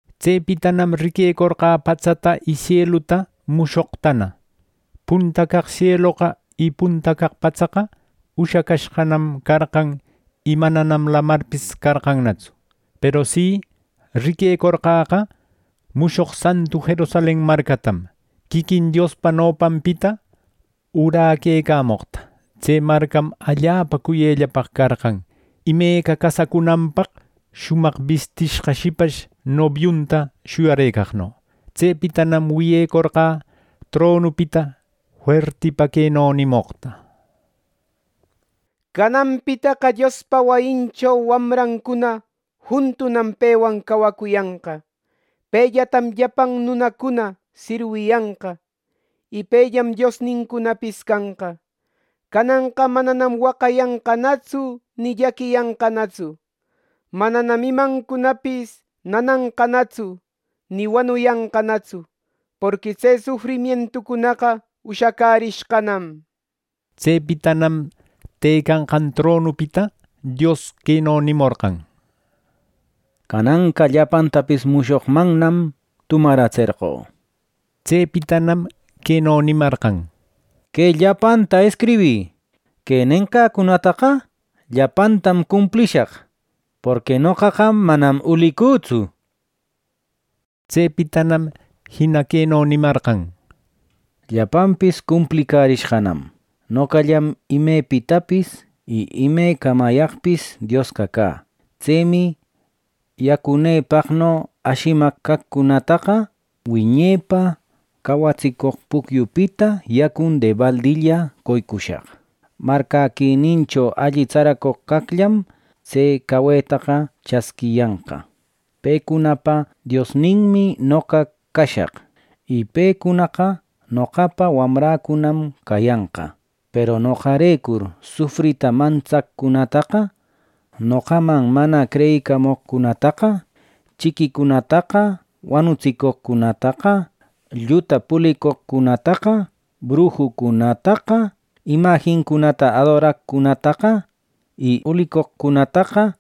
Tsepitanam riquecorqä patsata y sieluta mushoqtana. Punta caq sieloqa y punta caq patsaqa ushacashqanam carqan y mananam lamarpis carqannatsu. Peru si, riquecorqäqa mushoq santu Jerusalen marcatam, quiquin Diospa nopanpita uräquecamoqta. Tse marcam allapa cuyellapaq carqan. Imeca casacunanpaq shumaq bistishqa shipash nobiunta shuyarëcaqno. Tsepitanam wiyecorqä tronupita fuertipa queno nimoqta: “Cananpitaqa Diospa wayincho wamrancuna juntunam pewan cawacuyanqa. Pellatam llapan nunacuna sirwiyanqa, y pellam Diosnincunapis canqa. Cananqa mananam waqayanqanatsu ni llaquiyanqanatsu, mananam imancunapis nananqanatsu, ni wanuyanqanatsu. Porqui tse sufrimientucunaqa ushacärishqanam” nir. Tsepitanam tëcanqan tronupita Dios queno nimorqan: “Cananqa llapantapis mushoqmannam tumaratserqö” nir. Tsepitanam queno nimarqan: “Que llapanta escribï. Que nenqäcunataqa llapantam cumplishaq; porqui noqaqa manam ulicütsu” nir. Tsepitanam jina queno nimarqan: “Llapanpis cumplicärishqanam. Noqallam imepitapis y ime camayaqpis Diosqa cä. Tsemi yacunëpano ashimaq caqcunataqa wiñepa cawatsicoq pucyupita yacun debaldilla qoycushaq. Marcäquinincho alli tsaracoq caqllam tse cawetaqa chasquiyanqa. Pecunapa Diosninmi noqa cashaq. Y pecunaqa noqapa wamräcunam cayanqa. Peru noqarecur sufrita mantsaqcunataqa, noqaman mana creyicamoqcunataqa, chiquicunataqa, wanutsicoqcunataqa, lluta pulicoqcunataqa, brujucunataqa, imajincunata adoraqcunataqa y ulicoqcunataqa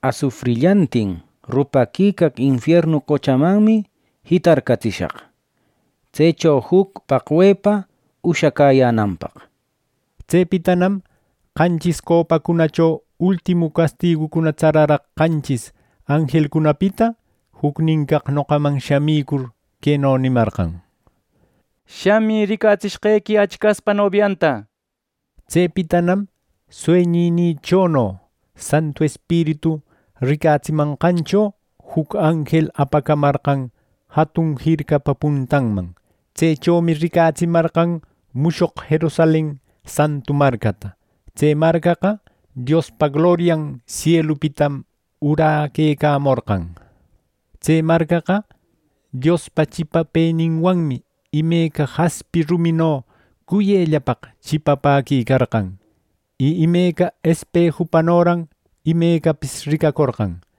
asufrillantin rupaquicaq infiernu qochamanmi jitarcatsishaq, tsecho juc paqwepa ushacäyänanpaq” nir. Tsepitanam qanchis copacunacho ultimu castigucuna tsararaq qanchis anjelcunapita jucnin caq noqaman shamicur queno nimarqan: “Shamï, ricatsishqequi Achcaspa nobianta” nir. Tsepitanam sueñïchono Santu Espiritu ricatsimanqancho juc anjel apacamarqan jatun jircapa puntanman. Tsechomi ricatsimarqan mushoq Jerusalen santu marcata. Tse marcaqa Diospa glorian sielupitam uräquecamorqan. Tse marcaqa Diospa chipapëninwanmi imeca jaspi rumino cuyellapaq chipapäquicarqan. Y imeca espejupanoran imecapis ricacorqan.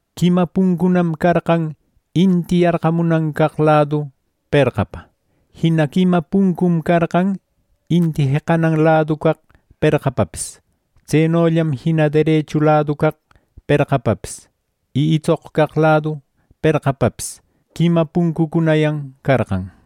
Quima puncucunam carqan inti yarqamunan caq ladu perqapa. Jina quima puncum carqan inti jeqanan ladu caq perqapapis. Tsenollam jina derechu ladu caq perqapapis y itsoq caq ladu perqapapis quima puncucunayan carqan.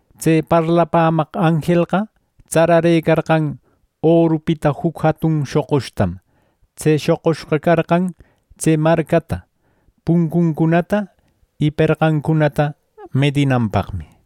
Tse parlapämaq anjelqa tsararëcarqan orupita juc jatun shoqushtam. Tse shoqushqa carqan tse marcata, puncuncunata y perqancunata medinanpaqmi.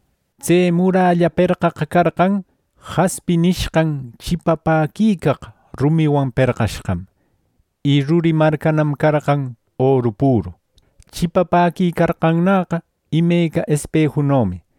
Tse muralla perqaqa carqan “jaspi” nishqan chipapäquicaq rumiwan perqashqam. Y ruri marcanam carqan oru püru. Chipapäquicarqannäqa imeca espejunomi.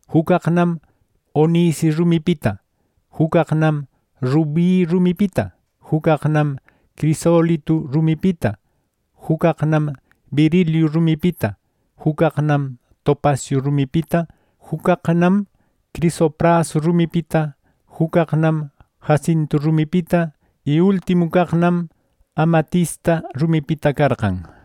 Juc caqnam onice rumipita, juc caqnam rubi rumipita, juc caqnam crisolitu rumipita, juc caqnam berilio rumipita, juc caqnam topasiu rumipita, juc caqnam crisopraso rumipita, juc caqnam jacintu rumipita, y ultimu caqnam amatista rumipita carqan.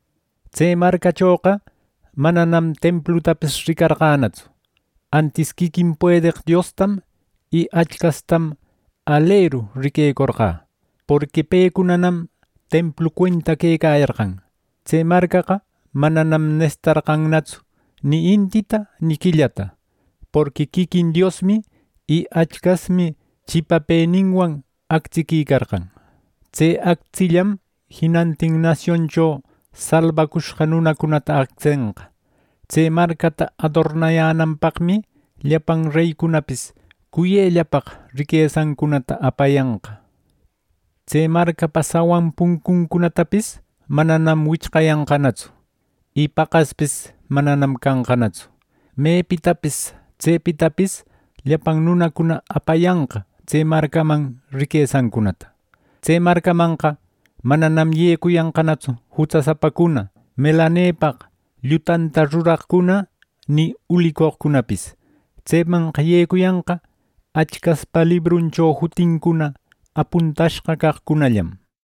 Tse marcachoqa mananam templutapis ricarqänatsu; antis quiquin puedeq Diostam y Achcastam aleru riquecorqä. Porqui pecunanam templu cuenta quecayarqan. Tse marcaqa mananam nesitarqannatsu ni intita ni quillata, porqui quiquin Diosmi y Achcasmi chipapëninwam actsiquicarqan. Tse actsillam jinantin nasioncho salbacushqa nunacunata actsenqa. Tse marcata adornayänanpaqmi llapan reycunapis cuyellapaq riquesancunata apayanqa. Tse marcapa sawan puncuncunatapis mananam wichqayanqanatsu. Y paqaspis mananam canqanatsu. Mepitapis, tsepitapis llapan nunacuna apayanqa tse marcaman riquesancunata. Tse marcamanqa mananam yecuyanqanatsu jutsasapacuna, melanepaq llutanta ruraqcuna, ni ulicoqcunapis. Tsemanqa yecuyanqa Achcaspa libruncho jutincuna apuntashqa caqcunallam.